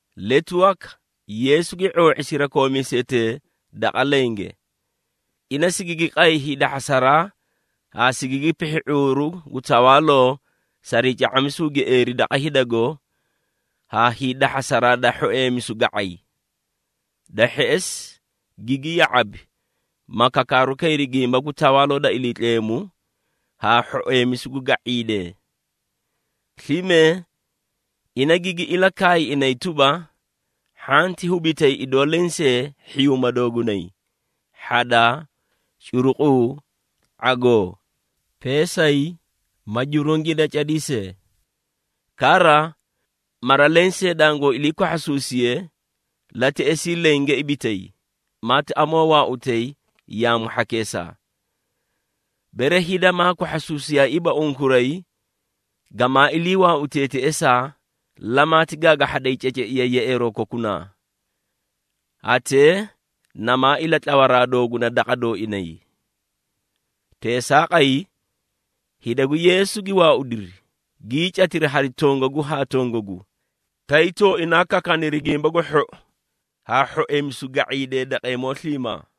Letu waka Yeesu gi ⁄oo⁄i sirakoomiisetee daqa lenge. Ina sigigi qay hiidahhasaraa haa sigigi pihhi ⁄uuru gu tawaaloo sarii ca⁄amisuu gieeri daqa hidago haa hiidahhasaraa da hhoeemisu ga⁄ay. Da hheꞌesi gigi ya⁄abi, ma kakaaru kayri gimba gu Tawaaloo da Iliitleemu, haa hhoeemisu gu ga⁄iidee. Slime ina gigi ilakaay inay tuba, “Hhanti hubitay idoo lensee hhiyuuma doogunay: hhadaa, curuquu, ⁄agoo, peesay ma jurungii da cadii see. Kara, mara lensee dangoo ilii kwahhasuusiye, laa teꞌesii lenge ibitay, maati amoo waautay yaamu hhakeesaa. Bere hida maa kwahhasuusiyaaiiba unkuray, gamaa ilii waautee teꞌesaa, lamaati gaagahhaday ceceiya yeꞌeeroo kokunaa. Hatee namaa ilatlawaraa dooguna daqa dooinay.” Teesaaqay, hida gu Yeesu gi waaudiri, gii catiri hari tongagu haa tongagu, tay tooinaa kakaaniri Gimba gu Hhou haa hhoeemisu ga⁄iidee daqeemoo sliimaa.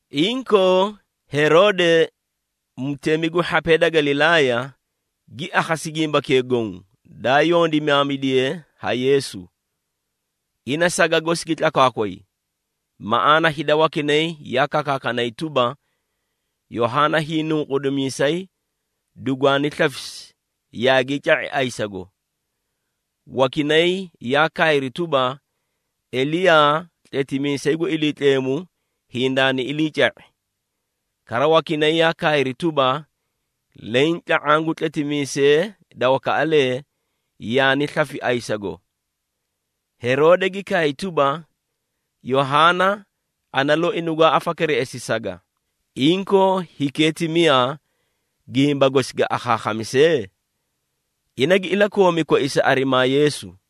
Inkoo Heroode, mutemi gu hhapee da Galilaaya, gi akhasi gimbakee goõ, daa yondimaamidiye ha Yeesu. Ina saga gosi gi tlakwaakway, maꞌaana hida wakinay yaa kakaakanay tuba, “Yohaana Hiinunqudimiisay dugwaani slafisi yaagii ca⁄i ayisago!” Wakinay yaa kaayri tuba, “Eliyaa, tletimiisay gu Iliitleemu hindaani iliica⁄i!” Kara wakinay yaa kaayri tuba, “Leẽ tla⁄aã gu tletimiisee da wakaꞌalee, yaani slafi ayisago.” Heroode gi kaay tuba, “Yohaana, ana loi nugwaa afakereꞌesi saga! Inkoo, hikee ti miyaa, gimba gosi ga akhaakhamise?” Ina gi ilakoomi koisa arimaa Yeesu.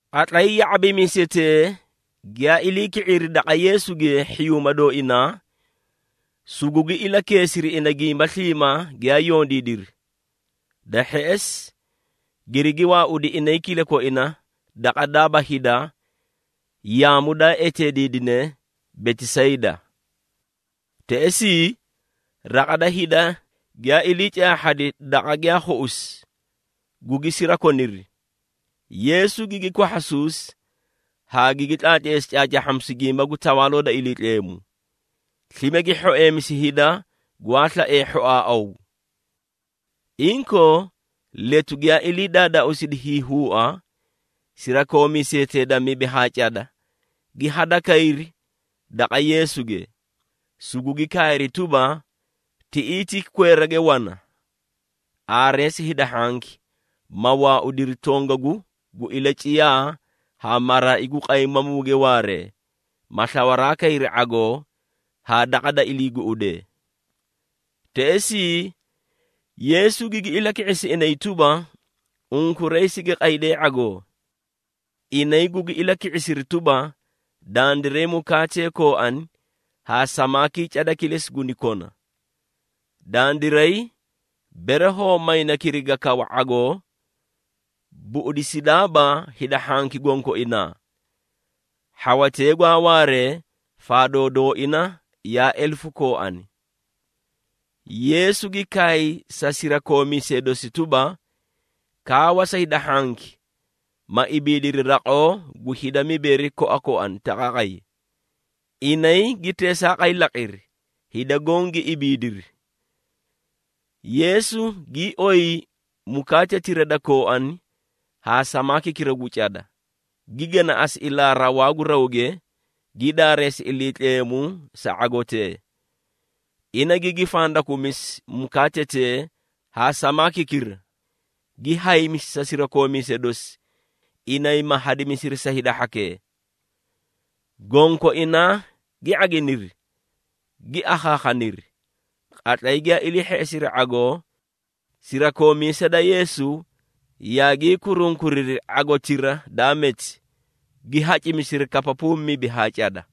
Qatlay ya⁄abimiisetee giyaa ilii ki⁄iri daqa Yeesuge hhiyuuma dooinaa, sugugi ilakeesiri ina gimba sliimaa giyaa yondiidiri. Da hheꞌesi, girigi waaudi inay kilakoina daqa daaba hida yaamu daa eteediidine Betisayda. Teꞌesii, raqa da hida giyaa ilii caahhadi daqa giyaa khuꞌusi, gugi sirakoniri. Yeesu gigi kwahhasuusi haa gigi tlaatleesi caacaahhamisu gimba gu Tawaaloo da Iliitleemu. Slime gi hhoeemisi hida gwaa slaee hhoaaꞌaw. Inkoo, letu giyaa ilii daadaauusidi hiihuua, sirakoomiisetee da mibi haa cada gi hadakayri daqa Yeesuge, sugugi kaayri tuba, “Tiꞌii ti kweerage wana. Aareesi hida hhanki, ma waaudiri tongagu gu ilaciyaa haa maraai gu qaymamuuge waaree, ma slawaraa kayri ⁄agoo haa daqa da ilii guꞌudee.” Teꞌesii Yeesu gigi ilaki⁄isi inay tuba, “Unkuray sigi qaydeei ⁄agoo!” Inay gugi ilaki⁄isiri tuba, “Dandiray mukaatee kooani haa samaakii cada kilesi guni kona. Dandiray, bere hoo mayna kiriga kawa ⁄agoo, buꞌudisidaaba hida hhanki gonkoinaa.” Hhawatee gwaa waaree, faadoo dooina yaa elefu kooani. Yeesu gi kaay sa sirakoomiisee dosi tuba, “Kaawa sa hida hhanki, ma ibiidiri raqoo gu hida mibeeri koakoani taqaaqay.” Inay gi teesaaqay laqiri, hida goõ gi ibiidiri. Yeesu gii oyi mukaatetira da kooani haa samaakikira gu cada, gi ganaꞌasi ilaa rawaa gu rawge, gi daareesi Iliitleemu sa ⁄agotee. Ina gigi fandakumisi mukaatetee haa samaakikira, gi haymisi sa sirakoomiisee dosi, inay ma hadimisiri sa hida hhakee. Gonkoinaa gi ⁄aginiri, gi akhaakhaniri. Qatlay giyaa ilii hheꞌesiri ⁄agoo, sirakoomiisee da Yeesu yaagii kurunkuriri ⁄agotira daa meti, gi hacimisiri kapapuu mibi haa cada.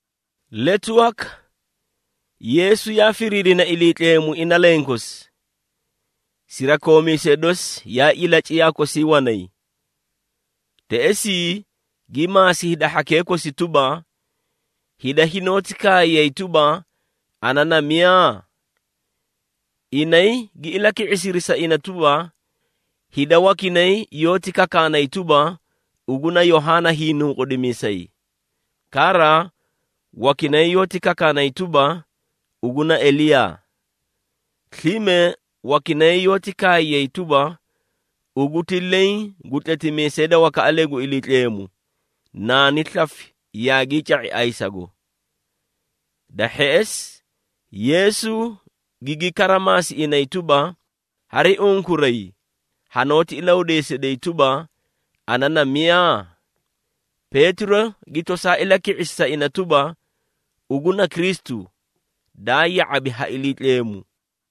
Letu waka, Yeesu yaa firiirina Iliitleemu ina lenkosi. Sirakoomiisee dosi yaa ilaciyaa kosii wanay. Teꞌesii gi maasi hida hhakee kosi tuba, “Hida hinoóti kaayay tuba, ana na miyaa?” Inay gi ilaki⁄isiri sa ina tuba, “Hida wakinay yoóti kakaanay tuba, ugu na Yohaana Hiinunqudimiisay. Kara, wakinay yoóti kakaanay tuba, ugu na Eliyaa. Slime wakinay yoóti kaayay tuba, ugu ti leẽ gu tletimiisee da wakaꞌalee gu Iliitleemu, naani slafi yaagii ca⁄i ayisago.” Da hheꞌesi Yeesu gigi kara maasi inay tuba, “Hari unkuray, hanoóti ilahudeesiday tuba, ana na miyaa?” Peetiro gi tosaa ilaki⁄isi sa ina tuba, “Ugu na Kristu, daa ya⁄abi ha Iliitleemu!”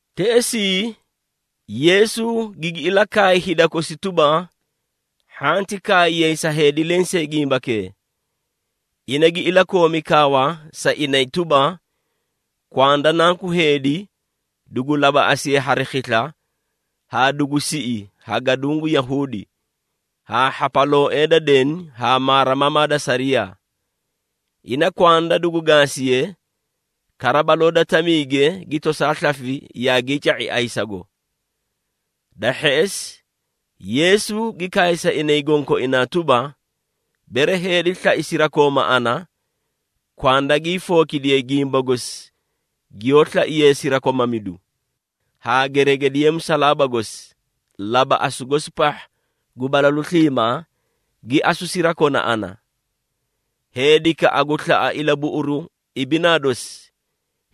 Teꞌesii Yeesu gigi ilakaay hida kosi tuba, hhanti kaayay sa heedi lensee gimbakee! Ina gi ilakoomi kaawa sa inay tuba, “Kwanda Nanku Heedi, dugu labaꞌasiye hari khisla haa dugu siꞌi ha gaduũ gu Yahuudi, haa hhapalooee da deni haa maarimamaa da sariyaa. Ina kwanda dugu gaasiye, kara baloo da tamiige gi tosaa slafi yaagii ca⁄i ayisago.” Da hheꞌesi, Yeesu gi kaay sa inay gonkoinaa tuba, “Bere heedi slai sirakooma ana, kwanda gi hiifookidiye gimba gosi giyoó slaiye sirakomamidu, haa geregediye musalaaba gosi, labaꞌasu gosi pahha gu balalu sliimaa, gi asu sirakona ana. Heedikaꞌa gu slaꞌa ilabuꞌuru ibinaa dosi,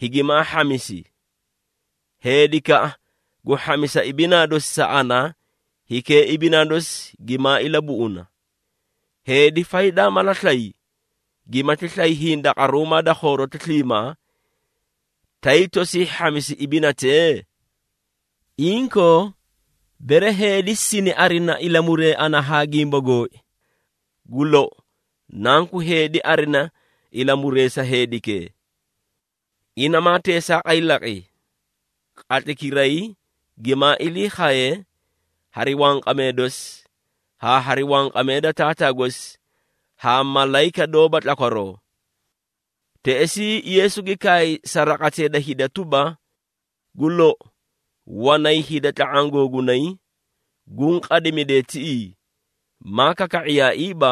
higimaa hhamisi. Heedikaꞌa gu hhamisa ibinaa dosi sa ana, hikee ibinaa dosi gimaa ilabuꞌuna. Heedi faydaa mala slay, gimati slay hindaqaruumaa da khooroti sliimaa, tay tosii hhamisi ibinatee? Inkoo, bere heedi sini arina ilamuree ana haa gimba gooi, gu lou, Nanku Heedi arina ilamuree sa heedikee. Ina maa teesaaqay laqi, qatlaykiray gimaa ilii khaye hari wanqamee dosi, haa hari wanqamee da Taataa gosi haa malayika doóba tlakwaroo.” Teꞌesii Yeesu gi kaay sa raqatee da hida tuba, “Gu lou, wanay hida tla⁄aã googunay, guũ qadimidee tiꞌii, maa kaka⁄iyaaiiba,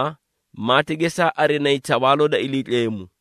maati gesaa arinayi Tawaaloo da Iliitleemu!”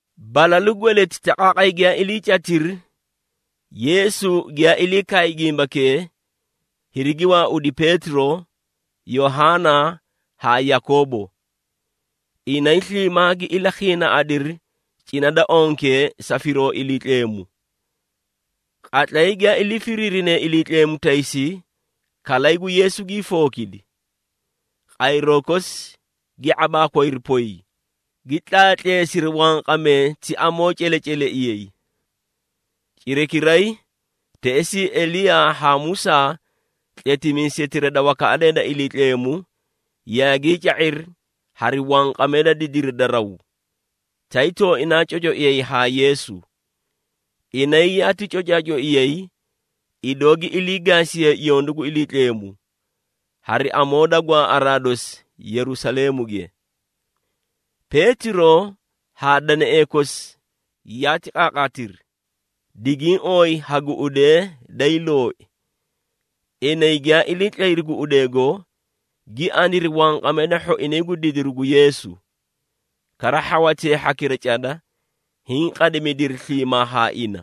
Balalu gweleti taqaaqay giyaa iliicatiri, Yeesu giyaa ilii kaay gimbakee, hirigi waaudi Peetiro, Yohaana haa Yakoobo. Inay sliimaa gi ilakhiinaaꞌadiri cina da onke sa firoo Iliitleemu. Qatlay giyaa ilii firiirine Iliitleemu taysi, kalay gu Yeesu gii fookidi. Qayroo kosi gi ⁄abaakwayri poy, gi tlaatleesiri wanqamee ti amoo celeceleiyay. Cirakiray, teꞌesii Eliyaa haa Musaa tletimiisetira da wakaꞌalee da Iliitleemu, yaagii ca⁄iri hari wanqamee da didiri da raw, tay tooinaa cocaiyay haa Yeesu. Inay yaati cocaacoiyay, idoo gi ilii gaasiye yondu gu Iliitleemu, hari amoo da gwaaꞌaraa dosi Yerusaleemuge. Peetiro haa deneꞌee kosi yaati qaaqaatiri, digiĩ ooyi ha guꞌudee day looi. Inay giyaa ilii tlayri guꞌudeego, gi aniri wanqamee da hhoinay gu didiru gu Yeesu, kara hhawatee hhakira cada, hiĩ qadimidiri sliimaa haa ina.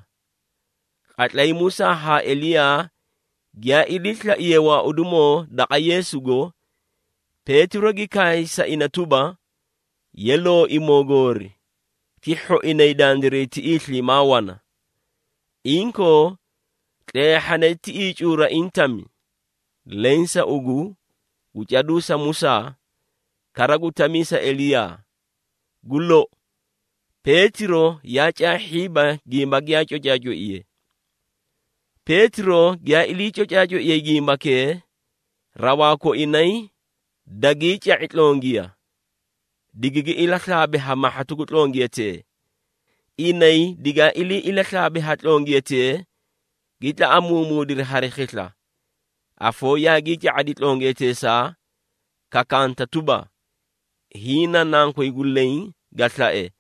Qatlay Musaa haa Eliyaa giyaa iliislaiyee waaudimoo daqa Yeesugo, Peetiro gi kaay sa ina tuba, “Ye, Looimoo Goori, ti hhoinay dandiray tiꞌii sliimaa wana. Inkoo tleehhane tiꞌii cuuraiĩ tami, leẽ sa ugu, gu caduu sa Musaa, kara gu tamii sa Eliyaa!” Gu lou, Peetiro yaa caahhiiba gimba giyaa cocaacoiye. Peetiro giyaa ilii cocaacoiye gimbakee, rawaa koinay dagii ca⁄i tlongiya, digigi ilaslaabi ha mahhatu gu tlongiyatee. Inay digaa ilii ilaslaabi ha tlongiyatee, gi tlaꞌamuumuudiri hari khisla. Afoo yaagii ca⁄adi tlongiyateesaa, kakaanta tuba, “Hiĩ na Nankoy gu leẽ ga slae,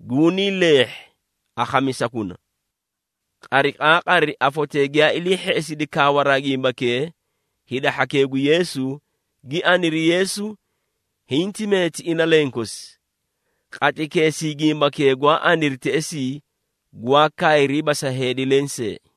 gunii leehhi! Akhamisakuna!” Qariqaaqari afotee giyaa ilii hheꞌesidi kaawaraa gimbakee, hida hhakee gu Yeesu, gi aniri Yeesu hinti meeti ina lenkosi. Qatlaykeesii gimbakee gwaa aniri teꞌesii, gwaa kaayriiba sa heedi lenseei.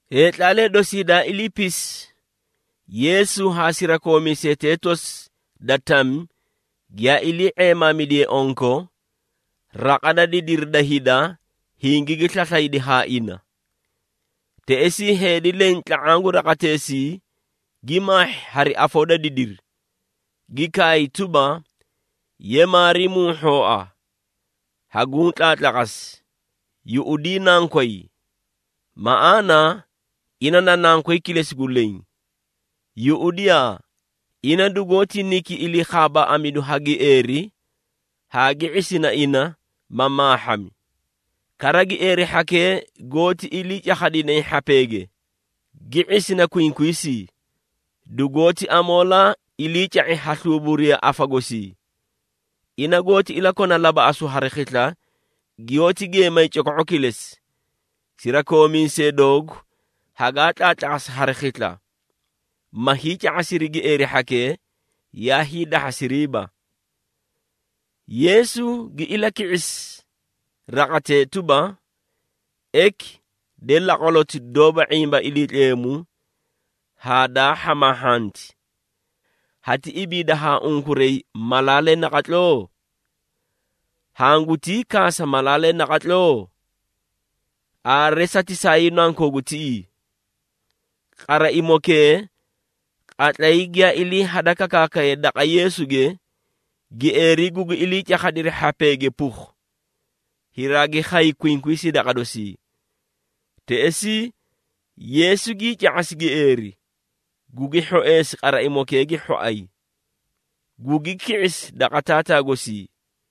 Heetlaalee dosii daa iliipisi, Yeesu haa sirakoomiisetee tosi da tami giyaa ilii ⁄eemaamidiye onko, raqa da didiri da hida hingigi slaslaydi haa ina. Teꞌesii heedi leẽ tla⁄aã gu raqateesii, gi maahhi hari afoo da didiri, gi kaay tuba, “Ye, Maarimuu hhooa! Haguũ tlaatlaqasi, yuꞌudii nankoy. Maꞌaana ina na nankoy kilesi gu leẽ. Yuꞌudiyaa, ina dugoóti niki ilii khaabaaꞌamidu ha gieeri haa gi ⁄isina ina, ma maahhami. Kara gieeri hhakee goóti ilii cakhadinay hhapeege, gi ⁄isina kwinkwiisii, dugoóti amoolaa iliica⁄i ha sluubariya afa gosii. Ina goóti ilakona labaꞌasu hari khisla, giyoóti geemay coko⁄o kilesi. Sirakoomiisee doogu hagaa tlaatlaqasi hari khisla, ma hiica⁄asiri gieeri hhakee, yaa hiidahhasiriiba.” Yeesu gi ilaki⁄isi raqatee tuba, “Eki, de laqwaloti doóba ⁄imba Iliitleemu haa daa hhamaahhanti! Hati ibiida haa unkuray malaalee naqatloo? Hangutii kaasa malaalee naqatloo? Aare satisaayuu nankoogu tiꞌii!” Qaraimokee, qatlay giyaa ilii hada kakaakaye daqa Yeesuge, gieeri gugi ilii cakhadi hhapeege pukhu, hiraagi khay kwinkwiisii daqa dosii. Teꞌesii Yeesu gii ca⁄asi gieeri, gugi hhoeesi qaraimokee gi hhoay, gugi ki⁄isi daqa taataa gosii.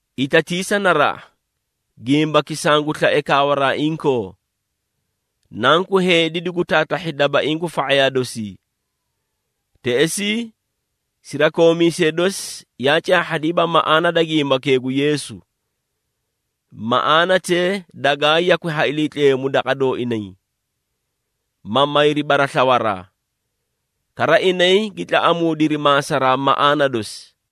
“Itatiisa naraꞌa, gimbaki sangu slae kaawaraa inkoo. Nanku Heedi dugu taatahhi dabaiĩ gu fa⁄ayaa dosii.” Teꞌesii, sirakoomiisee dosi yaa caahhadiiba maꞌaana da gimbakee gu Yeesu. Maꞌaanatee dagaa yakwi ha Iliitleemu daqa dooinay, ma mayri baraslawaraa. Kara inay gi tlaꞌamuudiri maasaraa maꞌaana dosi.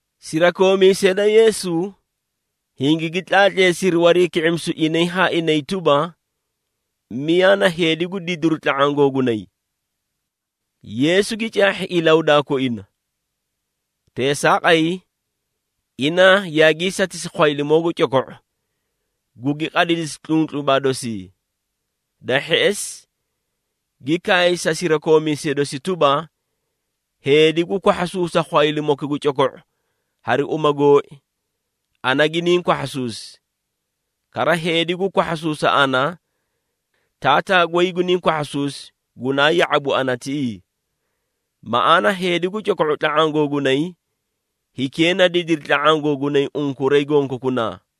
Sirakoomiisee da Yeesu, hingigi tlaatleesiri wariiki⁄imisu inay haa inay tuba, miyaa na heedi gu didiru tla⁄aã gooinay. Yeesu gi caahhi ilahudaa koina. Teesaaqay, ina yaagii satisi khwaylimoo gu coko⁄u, gugi qadidisi tluntlubaa dosii. Da hheꞌesi, gi kaay sa sirakoomiisee dosi tuba, “Heedi gu kwahhasuusa khwaylimoki gu coko⁄u hari uma gooi, ana giniĩ kwahhasuusi. Kara heedi gu kwahhasuusa ana, Taataa goy guniĩ kwahhasuusi, gunaa ya⁄abu ana tiꞌii. Maꞌaana heedi gu coko⁄u tla⁄aã googunay, hikee na didiri tla⁄aã googunay unkuray gonkokunaa.”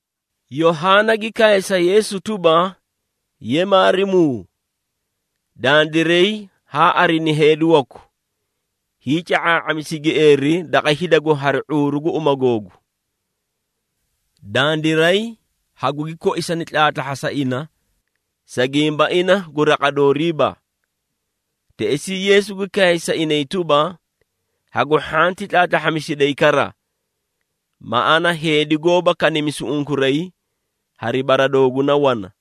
Yohaana gi kaay sa Yeesu tuba, “Ye, Maarimuu, dandiray haa arini heedi waku, hiica⁄aa⁄amisi gieeri daqa hidago hari ⁄uuru gu uma googu. Dandiray hagugi koisani tlaatlahhasa ina, sa gimba ina gu raqa dooriiba.” Teꞌesii Yeesu gi kaay sa inay tuba, “Hagu hhanti tlaatlahhamisiday kara, maꞌaana heedi goóba kanimisu unkuray, hari bara dooguna wana.”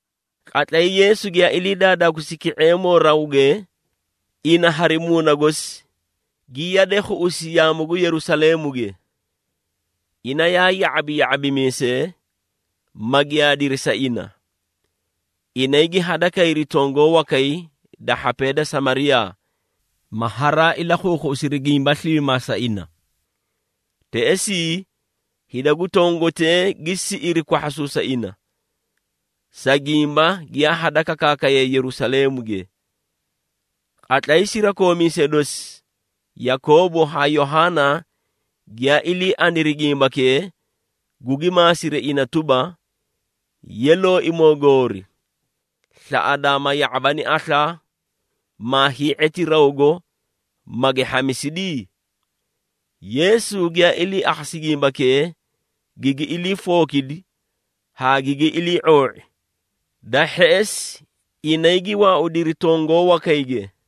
Qatlay Yeesu giyaa ilii daadaauusi ki⁄eemoo rawge, ina hari muuna gosi, gi yade khuꞌusi yaamu gu Yerusaleemuge. Ina yaa ya⁄abi ya⁄abimiisee, ma giyaadiri sa ina. Inay gi hadakayri tongoo wakay da hhapee da Samariyaa, ma haraa ilakhuukhuꞌusiri gimba sliimaa sa ina. Teꞌesii, hida gu tongotee gi siꞌiri kwahhasuusa ina, sa gimba giyaa hada kakaakaye Yerusaleemuge. Qatlay sirakoomiisee dosi, Yakoobo haa Yohaana giyaa ilii aniri gimbakee, gugi maasiri ina tuba, “Ye, Looimoo goori, slaꞌadaa ma ya⁄abani aslaa, maa hii⁄eti rawgo, magi hhamisidi?” Yeesu giyaa ilii akhasi gimbakee, gigi ilii fookidi haa gigi ilii⁄oo⁄i. Da hheꞌesi, inay gi waaudiri tongoo wakayge.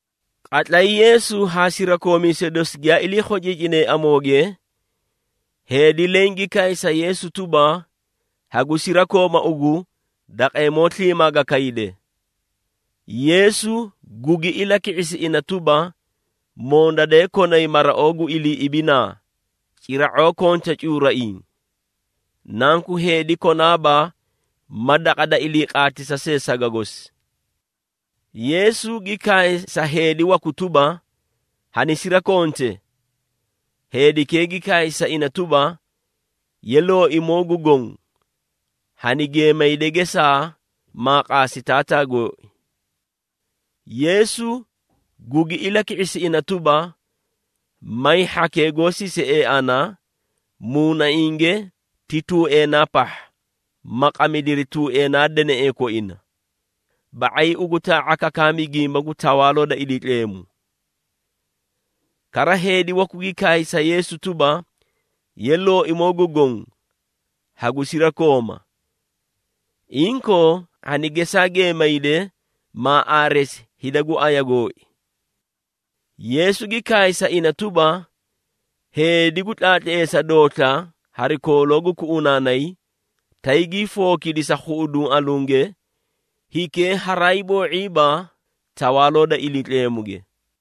Qatlay Yeesu haa sirakoomiisee dosi giyaa ilii khociicinee amooge, heedi leẽ gi kaay sa Yeesu tuba, “Hagu sirakooma ugu daqeemoo sliimaa ga kayde!” Yeesu gugi ilaki⁄isi ina tuba, “Mondadee konay maraoo gu ilii ibinaa, cira⁄oo konta cuuraiĩ. Nanku Heedi konaaba ma daqa da ilii qaatisa see saga gosi.” Yeesu gi kaay sa heedi waku tuba, “Hanisirakonte!” Heedikee gi kaay sa ina tuba, “Ye, Looimoo gu Goõ, hani geemayde gesaa, maa qaasi taataa gooi.” Yeesu gugi ilaki⁄isi ina tuba, “May hhakee goó sisiee ana, muunainge ti tuueenaa pahha, ma qamidiri tuueenaa deneꞌee koina. Ba⁄ay ugu taa⁄a kakaami gimba gu Tawaaloo da Iliitleemu.” Kara heedi waku gi kaay sa Yeesu tuba, “Ye, Looimoo gu Goõ, hagu sirakooma. Inkoo, hani gesaa geemayde, maa aareesi hida gu aya gooi.” Yeesu gi kaay sa ina tuba, “Heedi gu tlaatleesa doosla hari kooloo gu kuꞌunaanay, tay gii fookidi sa khuꞌuduũ alunge, hikee haraay boo⁄iiba, Tawaaloo da Iliitleemuge.”